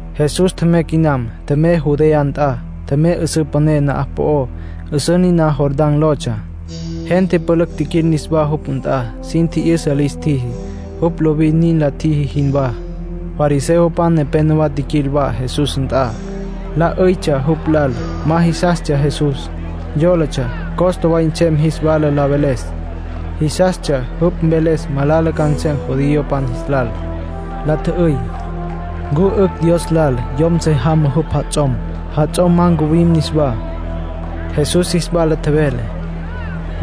Jesús tjemey quinam. Tjemey Judea nt'a. Tjemey 'üsǘ püné na'aj po'ó, 'üsǘ niná Jordán lotsja. Gente pülücj tjiquil niswá jupj nt'a. Sin tji'yüsa lis tjiji, jupj lovin nin la tjiji jinwá. Fariseopan nepénowa tjiquil wa Jesús nt'a, la 'üytsja jupj lal. Ma jisastsja Jesús. Yólatsja costa way nsem jis wala la veles. Jisastsja jupj mveles malala ca nsem judiopan jis lal. La tjü'üy: —¿Ncu 'ücj Dios lal yom se jamá jupj jats'om, jats'om ma ncuwim niswá? Jesús jis wala tjevele: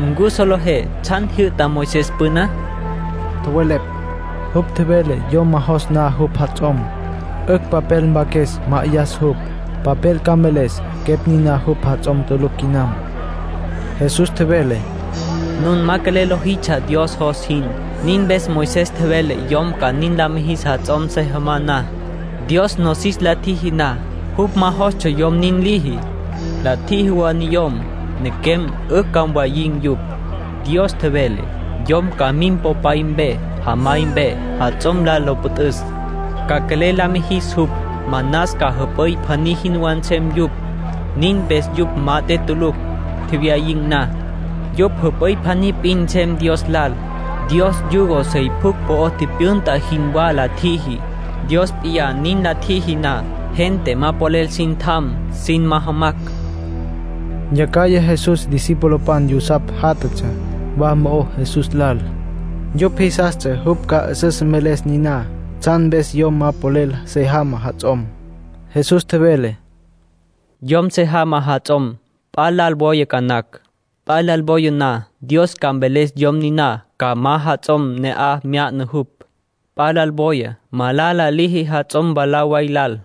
—¿Ncu solejé tsjan tjijyü'ta Moisés püná? Tjowelepj: —Jupj tjevele yom ma jos na jupj jats'om, 'ücj papel mpaques, ma'ayas jupj. Papel ca mveles quepj niná jupj jats'om tulucj quinam. Jesús tjevele: —Nun ma quelel lojitsja Dios jos jin. Nin mpes Moisés tjevele yom ca nin la mijis jats'om se jamá na. ”Dios nosis la tjiji na, jupj ma jostsja yom nin liji. ‘La tjiji wa niyom, nequem, 'ücj ca mwayin̈ yupj.’ Dios tjevele: ‘Yom ca mim popay mpe, jamay mpe, jats'om lal lo püt'üs. Ca quelel la mijis jupj. Manas ca jüp'üy pjaní jinwá nsem yupj.’ Nin mpes yupj mat'e tulucj, tjewyayin̈ na. Yupj jüp'üy pjaní p'in nsem Dios lal. Dios yugo sey pjucj po'o tipyünta jinwá la tjiji. Dios p'iyá nin la tjiji na, gente ma polel sin tjan sin majamacj —Jesús nin tjevele. Yacjaya Jesús discipulopan yusapj játjatsja wa mo'ó Jesús lal. Yupj jisastsja jupj ca 'üsüs mveles niná, tsjan mpes yom ma polel se jamá jats'om. Jesús tjevele: —Yom se jamá jats'om, p'a lal woya ca nacj. P'a lal woya na, Dios ca mveles yom niná ca ma jats'om ne'aj mya'na jupj. P'a lal woya, malala liji jats'om mwalá way lal.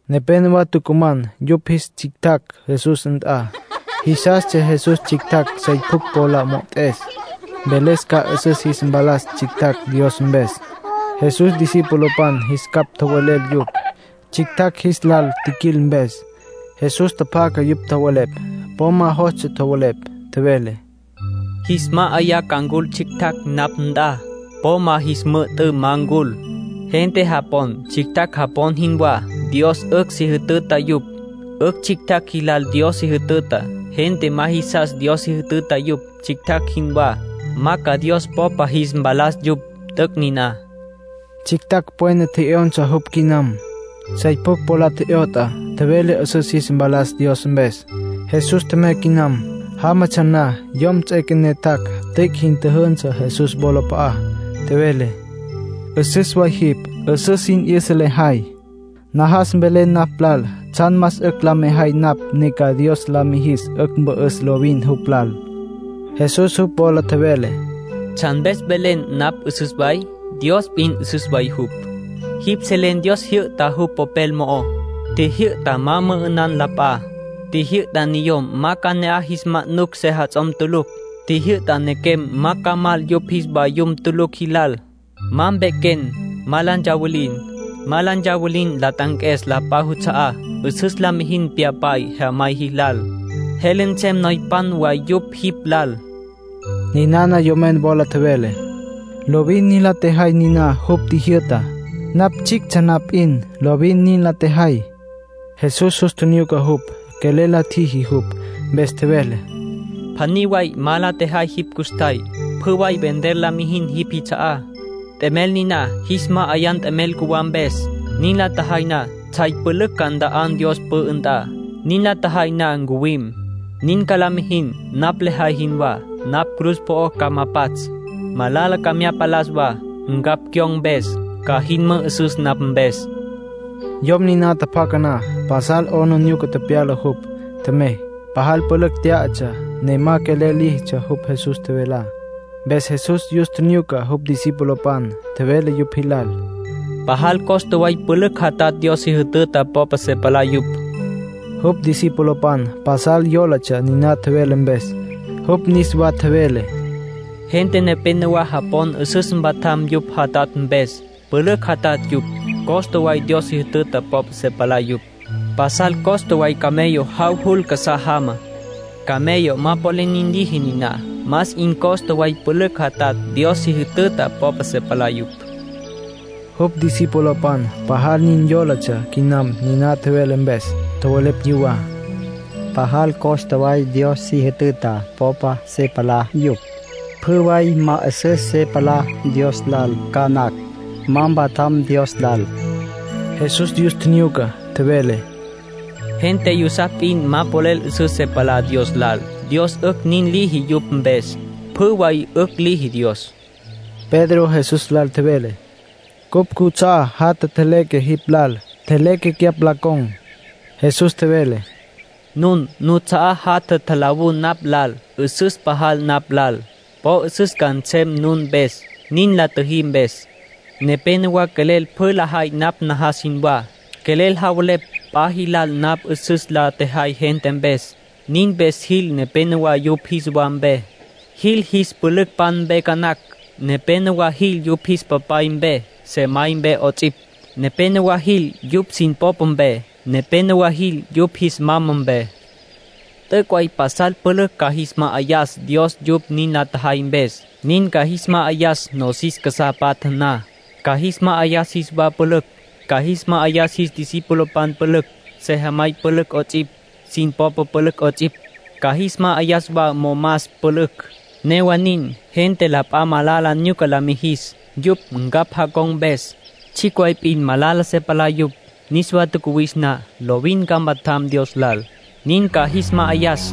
Nepénowa tucuman yupj jis tsjictjacj Jesús nt'a. Jisastsja Jesús tsjictjacj sey pjucj po la mo'ot'es, mveles ca 'üsüs jis mpalas tsjictjacj Dios mpes. Jesús discipulopan jis capj tjowelel yupj, tsjictjacj jis lal tjiquil mpes. Jesús tjapjaca yupj tjowelepj. Po ma jostsja tjowelepj. Tjevele: “Jis ma'ayá ca ncul tsjictjacj napj nt'a. Po ma jis müjü'tǘ ma ncul. Gente japon tsjictjacj japon jinwá, Dios 'ücj si jütüta yupj. 'Ücj tsjictjacj jilal Dios si jütüta. Gente ma jisas Dios si jütüta yupj, tsjictjacj jinwá, ma ca Dios popa jis mpalas yupj. T'üc' niná”, Jesús nin tjevele. Tsjictjacj pwena tje'yonsa jupj quinam. Sey pjucj po la tje'yot'a, tjevele 'üsüs jis mpalas Dios mpes. Jesús tjemey quinam. Jámatsja na yom ts'üequené, tjac', tüic' jin tjüjünsü Jesús wolap'a'á. Tjevele: —'Üsüs way jipj. 'Üsüs sin 'yüsa lejay. Najas mvelen napj lal tsjan más 'ücj la mejay napj ne ca Dios la mijis 'ücj mpü'üs lovin jupj lal. Jesús jupj wola tjevele: —¿Tsjan mpes tjevelen napj 'üsüs way? Dios p'in 'üsüs way jupj. Jipj selen Dios tjijyü'ta jupj Popel mo'ó. Tjijyü'ta ma mü'ü'nan la p'a. Tjijyü'ta niyom ma ca ne'aj jis manucj sejats'om tulucj. Tjijyü'ta nequem ma ca mal yupj jis vayum tulucj jilal. Ma mpequem. Ma la ntsawilin. Ma la ntsawilin la t'anques la p'a juts'a'á. 'Üsüs la mijin pyapay, jemay jilal. Jele nsem noypan way yupj jipj lal. Ninana yomen wola tjevele: —Lovin la tjejay niná jupj tjijyü'tá. Napj tsjictsja na p'in lovin nin la tjejay. Jesús jus tjinyuca jupj. Quelel la tjiji jupj, mpes tjevele: —Pjaní way ma la tjejay jipj custjay. Pjü way vender la mijin jipj jits'a'á. T'emel niná jis ma'ayan t'emel cjuwá mpes. Nin la tjejay na tsjay pülücj ca nta'an Dios pü'ü nt'a. Nin la tjejay na ncuwim. Nin ca la mijin napj lejay jinwá. Napj cruz po'ó ca ma pats'. Malala ca mya palas wa, ncapj cyon̈ mpes. Ca jin mü'üsüs napj mpes. Yom niná tjapjaca na, pasal 'aplijila tepyala jupj. Tjemey. Pajal pülücj tyá'atsja, ne ma quelel líjitsja jupj Jesús tjevelá. Mpes Jesús yus tjinyuca jupj discipulopan. Tjevele yupj jilal: —Pajal costa way pülücj jatatj Dios si jütüta popa se palá yupj. Jupj discipulopan pasal yólatsja niná tjevele mpes. Jupj niswa tjevele: —Gente nepénowa japon 'üsüs mpatjam yupj jatatj mpes; pülücj jatatj yupj. Costa way Dios si jütüta popa se palá yupj. Pasal costa way camello jav jul casá jama. Camello ma polel nin liji niná. Más 'in costa way pülücj jatatj Dios si jütüta popa se palá yupj. Jupj discipulopan pajal nin yólatsja quinam niná tjevele mpes. Tjowelepj yuwá: “Pajal costa way Dios si jütüta popa se palá yupj. Pjü way ma 'üsüs se palá Dios lal ca nacj, ma mpatjam Dios lal.” Jesús yus tjinyuca, tjevele: —Gente yusapj p'in ma polel 'üsüs se palá Dios lal. Dios 'ücj nin liji yupj mpes. Pjü way 'ücj liji Dios. Pedro Jesús lal tjevele: —Cupj cuts'a'á jatja tjeleque jipj lal. Tjeleque cyapj la con̈. Jesús tjevele: —Nun nuts'a'á jatja tjalawú napj lal, 'üsüs pajal napj lal. Po 'üsüs ca nsem nun mpes, nin la tjüjí mpes. Nepénowa quelel pjü lajay napj najas jinwá, quelel javelepj p'a jilal napj 'üsüs la tjejay gente mpes. Nin mpes jil nepenowá yupj jis wa mpe. Jil jis pülücpan mpe ca nacj. Nepénowa jil yupj jis papay mpe, sejamay mpe 'ots'ipj. Nepénowa jil yupj sin popa mpe. Nepénowa jil yupj jis mama mpe. T'üc' way pasal pülücj ca jis ma'ayas Dios yupj nin la tjajay mpes. Nin ca jis ma'ayas nosis casá patja na. Ca jis ma'ayas jis wa pülücj. Ca jis ma'ayas jis pülücpan pülücj, sejamay pülücj 'ots'ipj, sin popa pülücj 'ots'ipj. Ca jis ma'ayas wa momas pülücj. Newa nin, gente la p'a malala nyuca lis mijicj, yupj ncapj jacon̈ mpes. Tsjicj way p'in malala se palá yupj. Niswa tjacuwis na, lovin ca mpatjam Dios lal, nin ca jis ma'ayas.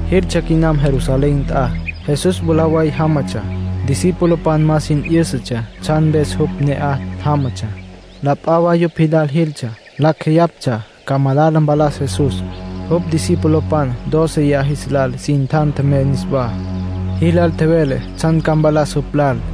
Jiltsja quinam Jerusalén nt'a. Jesús mwalá way jámatsja. Discipulopan ma sin 'yǘsatsja tsjan mpes jupj ne'aj jámatsja. La p'a wa yupj jis lal jiltsja, lacj jeyaptsja ca malala mpalas Jesús. Jupj discipulopan dóceya jis lal sin tjan tjemey niswá. Jilal tjevele tsjan ca mpalas jupj lal.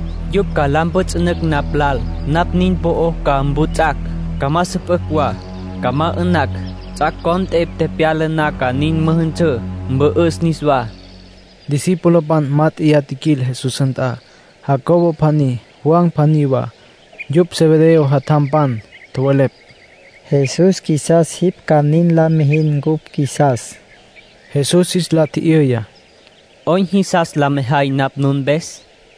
Yupj ca la mpjüts'ünücj napj lal. Napj nin po'ó ca mputs'acj, ca ma süpücj wa. Ca ma 'ü'nacj. Ts'ac' cont'e tepyala na ca nin müjünsǘ, mpü'üs niswá”, tjevele jupj. Discipulopan mát'eya tjiquil Jesús nt'a; Jacobo pjaní, Juan pjaní wa, yupj Zebedeo jatjampan. Tjowelepj: —Jesús, qjuisas jipj ca nin la mijin cupj qjuisas. Jesús jis la tji'yüya: —¿'Oyn jisas la mejay napj nun mpes?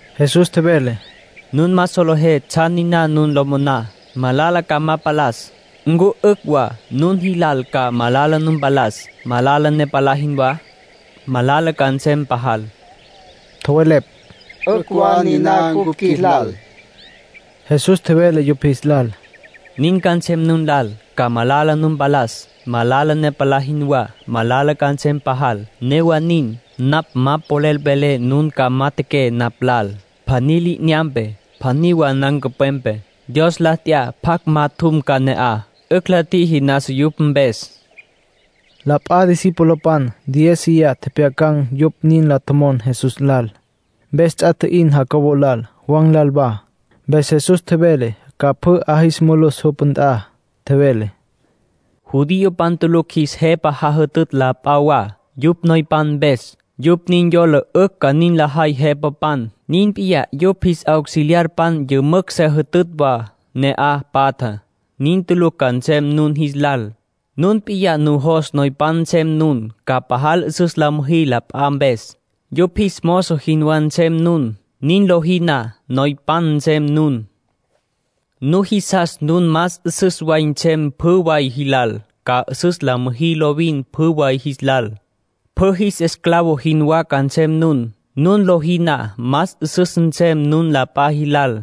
Jesús tjevele: —Nun ma solejé tsjan niná nun lo moná. Malala ca ma palas. ¿Ncu 'ücj wa nun jilal ca malala nu mpalas, malala ne palá jinwá? Malala ca nsem pajal. Tjowelepj: —'Ücj wa niná cupj qjuilal. Jesús tjevele yupj jis lal: —Nin ca nsem nun lal. Ca malala nu mpalas, malala ne palá jinwá. Malala ca nsem pajal. Newa nin, napj ma polel velé nun ca majatjaqué napj lal, pjaní li'inyampe, pjaní wa nancupwepe. Dios la t'ya pjacj majatjum ca ne'aj. 'Ücj la tjiji nasa yupj mpes —nin tjevele Jesús. La p'a discipulopan diéziya tjepjyacan̈ yupj nin la tjomon Jesús lal. Mpes ts'a tji'in Jacobo lal, Juan lal wa. Mpes Jesús tjevele ca pjü 'a jis mulus jupj nt'a. Tjevele: —Judiopan tulucj jis jepapan jajütütj la p'a wa, yupj noypan mpes. Yupj nin yola 'ücj nin lajay jepapan. Nin p'iyá yupj jis auxiliarpan yümücj se jütütj wa ne'aj patjá. Nin tulucj ca nsem nun jis lal. Nun p'in nujos noypan nsem nun, ca pajal 'üsüs la müjí la p'a mpes. Yupj jis mozo jinwá nsem nun. Nin lojí na, noypan nsem nun. Nujisas nun más 'üsüs way nsem pjü way jilal, ca 'üsüs la müjí lovin pjü way jis lal. Pjü jis esclavo jinwá ca nsem nun. Nin lojí na, más 'üsüs nsem nun la p'a jis lal.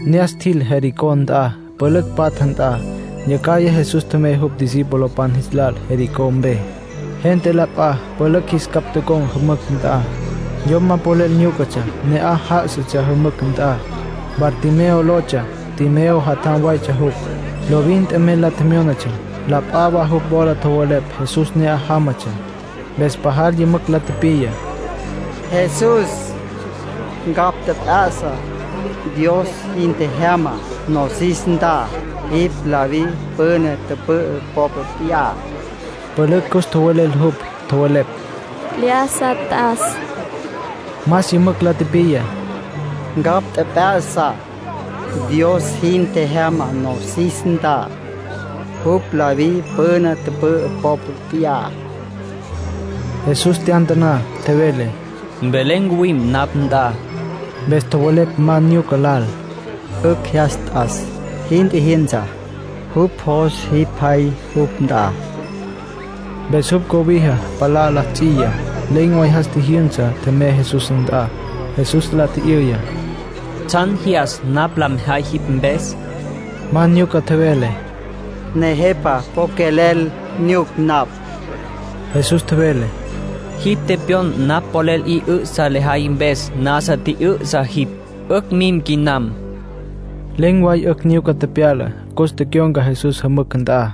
Ne'as tjil Jericó nt'a, pülücj patja nt'a. Yacjaya Jesús tjemey jupj discipulopan jis lal Jericó mpe. Gente la p'a pülücj jis capj tocon̈ jümücj nt'a. Yom ma polel nyúcatsja ne'aj já'asatsja jümücj nt'a. Bartimeo lotsja. Timeo jatjam waytsja jupj. Lovin t'emel la tjemyónatsja. La p'a wa jupj wola tjowelepj Jesús ne'aj jámatsja. Mpes pajal yümücj la tipiya: —Jesús, ncapj tjep'ya'sa. Dios jin tjejyama nosis nt'a. Jipj David püna tüpü'ü popa p'iyá. Pülücj cus tjowelel jupj. Tjowelepj: —¡Lyájasa t'as! Más yümücj la tipiya: —Ncapj tjep'ya'sa. Dios jin tjejyama nosis nt'a. Jupj David püna tüpü'ü popa p'iyá. Jesús tyantaná. Tjevele: —Mvelé ncuwim napj nt'a. Mpes tjowelepj ma nyuca lal: —'Ücj jyas t'as. Jin tjijyünsa. Jupj jos jipj jay jupj nt'a. Mpes jupj cobija palá la ts'iya. Len̈ way jas tjijyünsa, tjemey Jesús nt'a. Jesús la tji'yüya: —¿Tsjan jyas napj lejay jipj mpes? Ma nyuca tjevele: —Nejepa, po quelel nyuc napj. Jesús tjevele: —Jipj tepyon napj polel 'i 'ü'sa lejay mpes nasa 'i tjü'ü'sa jipj. 'Ücj mim quinam. Len̈ way 'ücj nyuca tepyala. Cus tecyon̈ca Jesús jümücj nt'a.